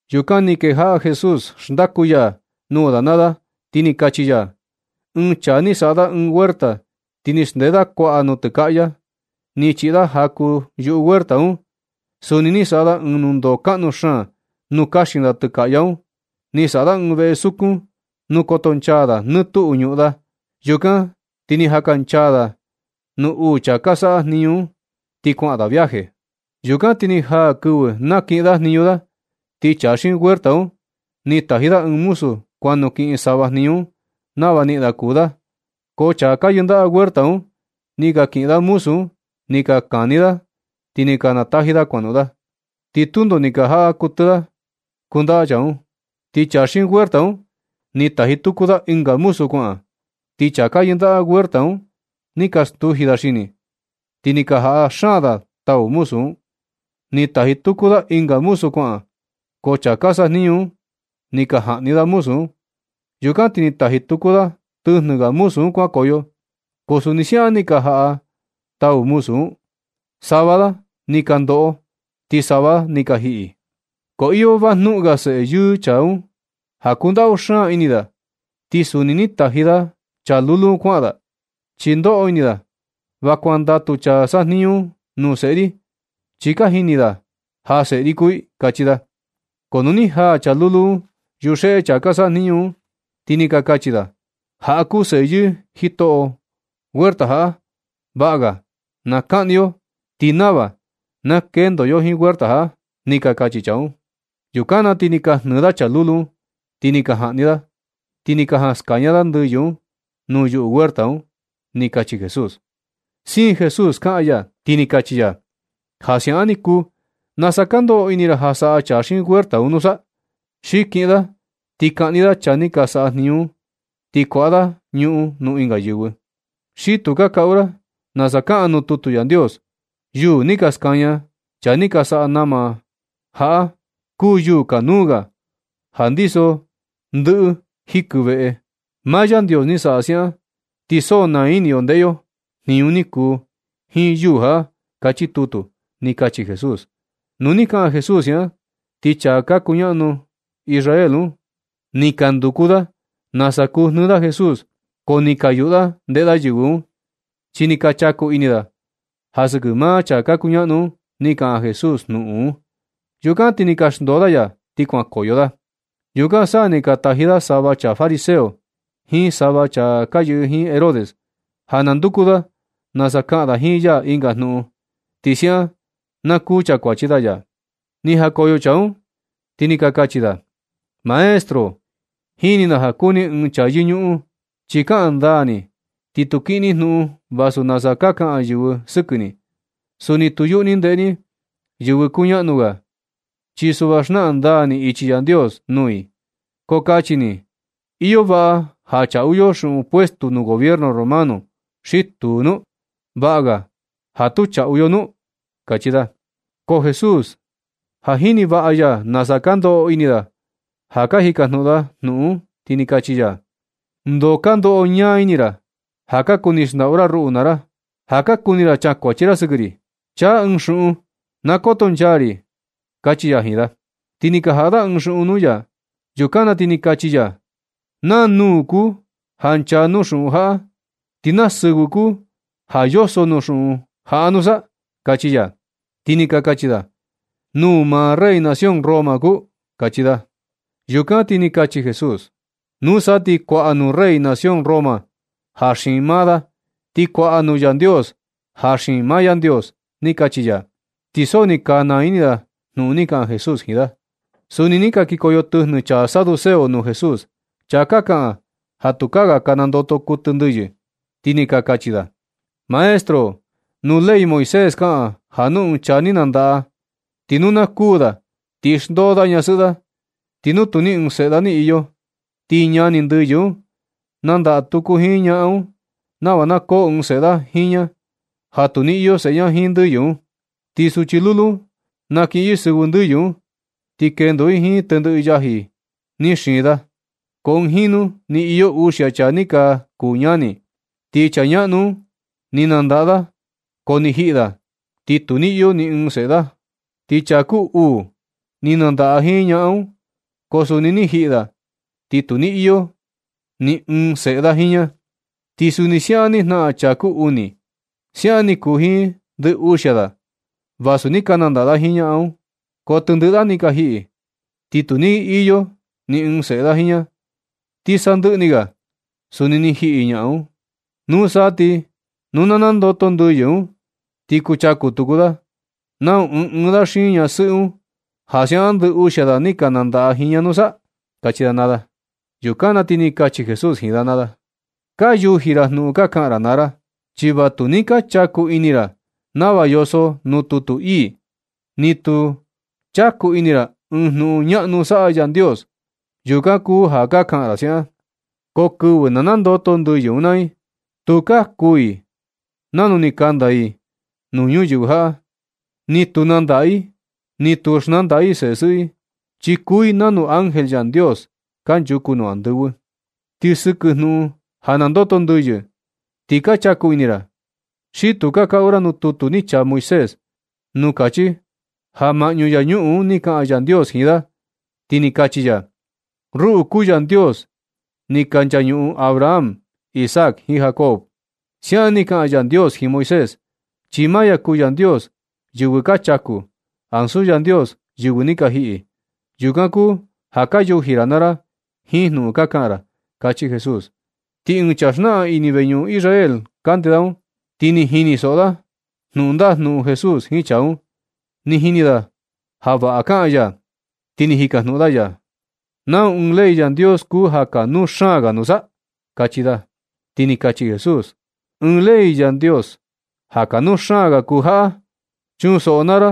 Yukan ni kejaꞌa Jesús xndaku ya nuu da naa da, ti ni kachi ya: ―Ɨɨn chaa ni saꞌa da ɨɨn huerta, ti ni xndee kuaꞌa da nutɨkaꞌya. Ni chiꞌi da jaku yuu huerta un. Suni ni saꞌa da ɨɨn nundoo kaꞌnu xaan nuu kaxin da tɨkaꞌya un. Ni saꞌa da ɨɨn veꞌev sukun, nuu kotonchaa da nɨ tuꞌu ñuꞌun da. Yukan ti ni jakanchaa da nuu uu chaa ka saꞌa jniñu un, ti kuaꞌan da viaje. Yukan ti ni jaa kɨvɨ nakiꞌin da jniñu da, ti chaa xiin huerta un, ni taji da ɨɨn muzu kuan nukiꞌin sava jniñu un nava niꞌin da kuu da. Ko chaa ka yɨndaꞌa huerta un, ni ka kiꞌin da muzu un ni ka kani da, ti ni ka nataji da kuanoꞌon. Ti tundo ni ka jaꞌa kuɨtɨ da kundaꞌa chaa un. Ti chaa xiin huerta un ni taji tuku da ɨnga muzu kuaꞌan. Ti chaa ka yɨndaꞌa huerta un ni ka stuji da xini, ti ni ka jaꞌa xaan da tau muzu un. Ni taji tuku da ɨnga muzu kuaꞌan, ko chaa ka sajniñu un ni ka jaꞌni da muzu un. Yukan ti ni taji tuku da tɨjnɨ ga muzu un kuankoyo, ko suni siaꞌan ni ka jaꞌa da tau muzu un. Sava da ni ka ndoꞌo, ti sava ga da ni ka jiꞌi. Ko iyo vajnuꞌun ga seꞌe yɨɨ chaa un ja kundaꞌu xaan ini da, ti suni ni taji da chaa lulu un kuaꞌan da, chi ndoꞌo ini da, “Va kuandatu chaa ka sajniñu un nuu seꞌe ri, chi ka jini da ja seꞌe ri kuu i”, kachi da. Ko nu ni jaa chaa lulu un yuxeꞌe chaa ka saꞌa jniñu un, ti ni ka kachi da: “Jaꞌa kuu seꞌe yɨɨ jitoꞌo huerta jaꞌa. Vaꞌa ga na kaꞌni yo, ti nava na kendo yo jiin huerta jaꞌa”, ni ka kachi chaa un. Yukan na ti ni ka jnɨɨ da chaa lulu un, ni ka jaꞌni da, ti ni ka jan skaña da ndɨyɨ un nuu yuꞌu huerta un ―ni kachi Jesús. Siin Jesús kaꞌan ya, ti ni kachi ya: ―Ja siaꞌan ni kuu, ¿nasa ka ndoꞌo ini ra ja saꞌa chaa xiin huerta un nusa? Xi kiꞌin da ti kaꞌni da chaa ni ka saꞌa jniñu un, ti kuaꞌa da ñuꞌun nuu ɨnga yɨvɨ. Xi tu ka kaꞌu ra nasa kaꞌan nuu tutu Yandios: Yuū ni ka skaña chaa ni ka saꞌa nama jaꞌa, kuu yuū kanuu ga ja ndiso ndɨꞌɨ jikɨ veꞌe. Maa Yandios ni saꞌa siaꞌan, ti so naa ini yo ndeꞌe yo jniñu ni kuu jiin yuū jaꞌa. Kachi tutu ―ni kachi Jesús. Nu ni kaꞌan Jesús siaꞌan, ti chaa ka kuñaꞌnu Israel un, ni ka nduku da nasa kuu jnɨɨ da Jesús, ko ni ka yuꞌu da ndeꞌe da yɨvɨ un. Chi ni ka chaku ini da ja sɨkɨ maa chaa ka kuñaꞌnu un, ni kaꞌan Jesús jnuꞌun un. Yukan ti ni ka xndoo da ya ti kuankoyo da. Yukan sa ni ka taji da sava chaa fariseo jiin sava chaa ka yɨꞌɨ jiin Herodes, ja na nduku da nasa kaꞌan da jiin ya ɨnga jnuꞌun, ti siaꞌan na kuu chakuachi da ya. Ni jakoyo chaa un, ti ni ka kachi da: ―Maestro, jini na ja kuu ni ɨɨn chaa yɨñuꞌun, chi kaꞌan ndaa ni, ti tu kiꞌin ni jnuꞌun vasu nasa ka kaꞌan yɨvɨ sɨkɨ ni. Suni tu yuꞌu ni ndeꞌe ni yɨvɨ kuñaꞌnu ga. Chi suꞌva xnaꞌan ndaa ni ichi Yandios nuu i. Ko kachi ni, ¿iyo vaꞌa ja chaꞌu yo xuꞌun puestu nuu gobierno Romano xi tuu nu? ¿Vaꞌa ga ja tu chaꞌu yo nu? ―kachi da. Ko Jesús ja jini vaꞌa ya nasa ka ndoꞌo ini da ja ka jikajnuꞌun da jnuꞌun un, ti ni kachi ya: ―¿Ndoo ka ndoꞌo ñaa ini ra ja ka kuni xndaꞌu ra ruꞌu naa ra, ja ka kuni ra chakuachi ra sɨkɨ ri? Chan ɨɨn xuꞌun na Kotonchaa ri ―kachi ya jiin da. Ti ni ka jaꞌa da ɨɨn xuꞌun nuu ya. Yukan na ti ni kachi ya: ―¿Naa nūū kuu ja nchaa nuu xuꞌun jaꞌa, ti naa sɨvɨ kuu ja yoso nuu xuꞌun jaꞌa nusa? ―kachi ya. Ti ni ka kachi da: ―Nūū maa rey nación Roma kuu ―kachi da. Yukan na ti ni kachi Jesús: ―Nusa ti kuaꞌa nuu rey nación Roma ja xiin maa da, ti kuaꞌa nuu Yandios ja xiin maa Yandios ―ni kachi ya. Ti so ni ka naa ini da jnuꞌun ni kaꞌan Jesús jiin da. Suni ni ka kikoyo tɨjnɨ chaa Saduceo nuu Jesús, chaa ka kaꞌan ja tukaa ga ka nandoto kuɨtɨ ndɨyɨ. Ti ni ka kachi da: ―Maestro, nuu ley Moisés kaꞌan ja nu ɨɨn chaa ni nandaꞌa, ti nu na kuū da, ti xndoo da ñasɨꞌɨ da. Ti nu tu ni ɨɨn seꞌe da ni iyo, ti ñani ndɨyɨ un nandaꞌa tuku jiin ñaꞌan un nava na koo ɨɨn seꞌe da jiin ña, ja tu ni iyo seꞌe ña jiin ndɨyɨ un. Ti suchi lulu un nakiꞌin yɨ sɨvɨ ndɨyɨ un, ti kendo i jiin tendɨꞌɨ yaji ni xiin da. Ko ɨɨn jinu ni iyo uxia chaa ni ka kuu ñani, ti chaa ñaꞌnu un ni nandaꞌa da, ko ni jiꞌi da, ti tu ni iyo ni ɨɨn seꞌe da. Ti chaa kuu uu un, ni nandaꞌa jiin ñaꞌan un, ko suni ni jiꞌi da, ti tu ni iyo ni ɨɨn seꞌe da jiin ña. Ti suni siaꞌan ni jnaꞌan chaa kuu uni. Siaꞌan ni kuu jiin ndɨ uxia da, vasu ni ka nandaꞌa da jiin ñaꞌan un, ko tendɨꞌɨ da ni ka jiꞌi, ti tu ni ka iyo ni ɨɨn seꞌe da jiin ña. Ti sandɨꞌɨ ni ga suni ni jiꞌi ñaꞌan un. Nusa ti nu na nandoto ndɨyɨ un ti kuchaku tuku da, ¿nau ɨɨn ɨɨn da xiin ñasɨꞌɨ un, ja siaꞌan ndɨ uxia da ni ka nandaꞌa jiin ña nusa? ―kachi chaa un. Yukan na ti ni kachi Jesús jiin da naa da: ―Ka yuji ra jnuꞌun ka kaꞌan ra naa ra, chi va tu ni ka chaku ini ra nava yoso nuu tutu ii. Ni tu chaku ini ra ɨɨn jniñu ñaꞌnu saꞌa Yandios. Yukan kuu ja ka kaꞌan ra siaꞌan. Ko kɨvɨ na nandoto ndɨyɨ un naa i, tukaa kuu i nanu ni kanda i nuu ñuyɨvɨ jaꞌa. Ni tu nandaꞌa i, ni tu xnandaꞌa i sesɨꞌɨ i, chi kuu i nanu ángel Yandios kanchuku nuu andɨvɨ. Ti sɨkɨ jnuꞌun ja nandoto ndɨyɨ un, ti ka chaku ini ra, xi tu ka kaꞌu ra nuu tutu ni chaa Moisés, nuu kachi ja maꞌñu yañuꞌun un ni kaꞌan Yandios jiin da, ti ni kachi ya: “Ruꞌu kuu Yandios ni ka nchañuꞌun Abraham, Isaac jiin Jacob.” Siaꞌan ni kaꞌan Yandios jiin Moisés, chi maa ya kuu Yandios yɨvɨ ka chaku, ansu Yandios yɨvɨ ni ka jiꞌi. Yukan kuu ja ka yuji ra naa ra jiin jnuꞌun ka kaꞌan ra ―kachi Jesús. Ti ɨɨn chaa xnaꞌan ini veñuꞌun Israel kande da un, ti ni jinisoꞌo da jnuꞌun ndajnuꞌun Jesús jiin chaa un. Ni jini da ja vaꞌa kaꞌan ya, ti ni jikajnuꞌun da ya: ―¿Nau ɨɨn ley Yandios kuu ja kanuu xaan ga nusa? ―kachi da. Ti ni kachi Jesús. ―Ɨɨn ley Yandios ja kanuu xaan ga kuu jaꞌa: “Chunsoꞌo naa ra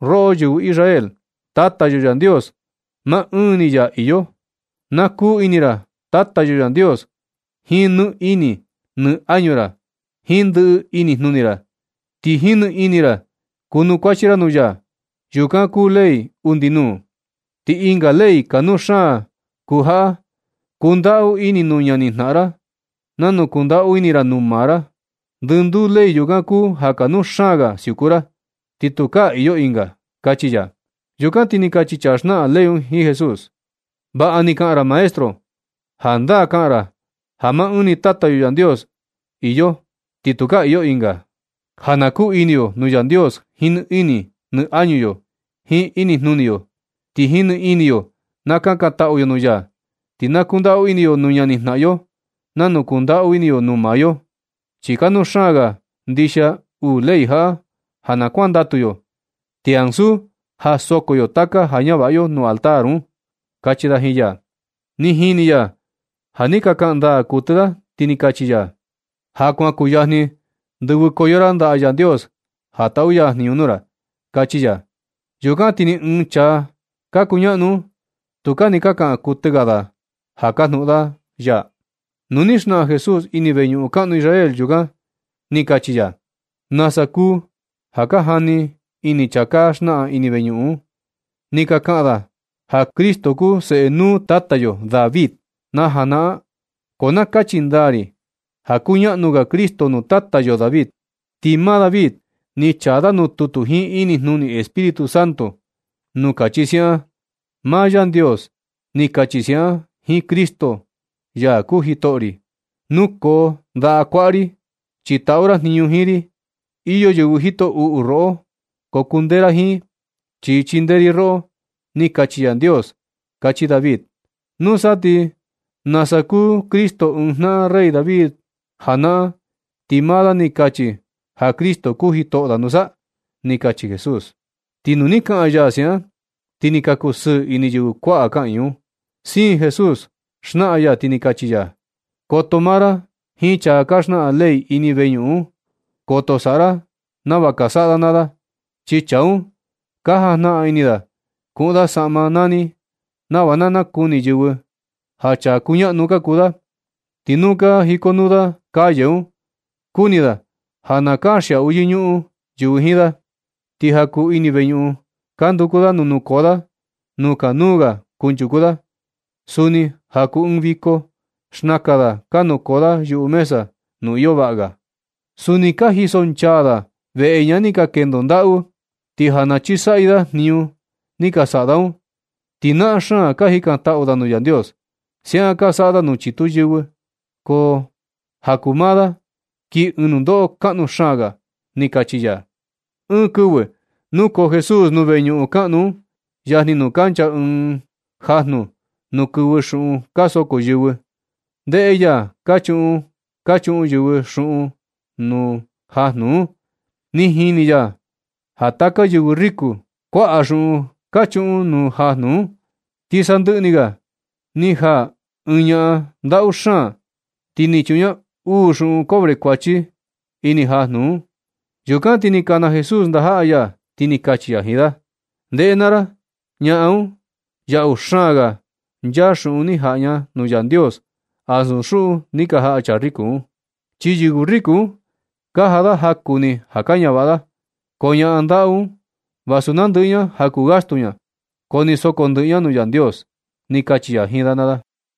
roꞌo yɨvɨ Israel. Tata yo Yandios maa ɨɨn ni ya iyo. Na kuu ini ra Tata yo Yandios jiin nɨ ini nɨ añu ra, jiin ndɨꞌɨ inijnuni ra, ti jiin nɨini ra kunukuachi ra nuu ya.” Yukan kuu ley undi nuu. Ti ɨnga ley kanuu xaan kuu jaꞌa: “Kundaꞌu ini nuu ñanijnaꞌan ra nanu kundaꞌu ini ra nuu maa ra.” Ndɨnduu ley yukan kuu ja kanu xaan ga siuku ra, ti tukaa iyo ɨnga ―kachi ya. Yukan ti ni kachi chaa xnaꞌan ley jiin Jesús: ―Vaꞌa ni kaꞌan ra, Maestro. Jandaa kaꞌan ra ja maa ɨɨn ni Tata yo Yandios iyo, ti tukaa iyo ɨnga, ja na kuu ini yo nuu Yandios jiin nɨ ini nɨ añu yo, jiin inijnuni yo, ti jiin nɨini yo na kunukuachi yo nuu ya. Ti na kundaꞌu ini yo nuu ñanijnaꞌan yo nanu kundaꞌu ini yo nuu maa yo. Chi kanuu xaan ga ndixia uu ley jaꞌa ja na kuandatu yo, ti ansu ja soko yo taka ja ñavaꞌa yo nuu altar un ―kachi da jiin ya. Ni jini ya ja ni ka kaꞌan ndaa kuɨtɨ da, ti ni kachi ya: ―Ja kuan kuyajni ndɨvɨkoyo ra ndaꞌa Yandios ja taꞌu ya jniñu nuu ra ―kachi ya. Yukan ti ni ɨɨn chaa ka kuñaꞌnu un tukaa ni ka kaꞌan kuɨtɨ ga da ja kajnuꞌun ga da ya. Nu ni xnaꞌan Jesús ini veñuꞌun kaꞌnu Israel yukan, ni kachi ya: ―¿Nasa kuu ja ka jani ini chaa ka xnaꞌan ini veñuꞌun un, ti ka kaꞌan da ja Cristo kuu seꞌe nuu tata yo David na janaꞌan? Ko na kachi ndaa ri ja kuñaꞌnu ga Cristo nuu tata yo David. Ti maa David ni chaa da nuu tutu jiin inijnuni Espíritu Santo nuu kachi siaꞌan: Maa Yandios ni kachi siaꞌan jiin Cristo, ya kuu jitoꞌo ri: “Nukoo ndaꞌa kuaꞌa ri, chi taꞌu ra jniñu jiin ri. Iyo yɨvɨ jito uꞌu roꞌo, ko kundee ra jiin, chi chindee ri roꞌo.” Ni kachi Yandios, kachi David. Nusa, ¿ti nasa kuu Cristo ɨɨn jnaꞌan rey David janaꞌan, ti maa da ni kachi ja Cristo kuu jitoꞌo da nusa? ―ni kachi Jesús. Ti nu ni kaꞌan ya siaꞌan, ti ni ka kusɨɨ ini yɨvɨ kuaꞌa kaꞌiin un. Siin Jesús xnaꞌan ya, ti ni kachi ya: ―Koto maa ra jiin chaa ka xnaꞌan ley ini veñuꞌun un. Koto saꞌa ra nava ka saꞌa da naa da. Chi chaa un ka jajnaꞌan ini da kuꞌun da saꞌma nani nava na nakuni yɨvɨ ja chaa kuñaꞌnu ka kuu da. Ti nu ka jikonuu da calle un, kuni da ja na kanxiaꞌu yɨñuꞌun yɨvɨ jiin da. Ti ja kuu ini veñuꞌun ka nduku da nuu nukoo da nuu kuñaꞌnu ga kunchuku da. Suni ja kuu ɨɨn viko, xnaka da ka nukoo yuꞌu mesa nuu iyo vaꞌa ga. Suni ka jisonchaa da veꞌe ñaꞌan ni ka kendo ndaꞌu, ti ja na chisaꞌyɨ da jniñu ni ka saꞌa da un, ti naꞌan xaan ka jikantaꞌu da nuu Yandios. Siaꞌan ka saꞌa da nuu chitu yɨvɨ. Ko ja kuu maa da, kii ɨɨn nundoꞌo kaꞌnu xaan ga ―ni kachi ya. Ɨɨn kɨvɨ nukoo Jesús nuu veñuꞌun kaꞌnu un, yajni nuu kancha ɨɨn kaja nuu kɨvɨ xuꞌun ka soko yɨvɨ. Ndeꞌe ya ka chuꞌun ka chuꞌun yɨvɨ xuꞌun nuu kaja un. Ni jini ya ja taka yɨvɨ riko, kuaꞌa xuꞌun ka chuꞌun nuu kaja un. Ti sandɨꞌɨ ni ga ni jaa ɨɨn ñaꞌan ndaꞌu xaan, ti ni chuꞌun ña uu xuꞌun cobre kuachi ini kaja un. Yukan ti ni kana Jesús ndajaꞌa ya, ti ni kachi ya jiin da: ―Ndeꞌe naa ra. Ñaꞌan un, yaꞌu xaan ga nchaa xuꞌun ni jaꞌa ña nuu Yandios ansu xuꞌun ni ka jaꞌa chaa riko un. Chi yɨvɨ riku un ka jaꞌa da jaku ni ja ka ñavaꞌa da. Ko ñaꞌan ndaꞌu un, vasu nandɨꞌɨ ña ja kuu gastu ña, ko ni soko ndɨꞌɨ ña nuu Yandios ―ni kachi ya jiin da naa da.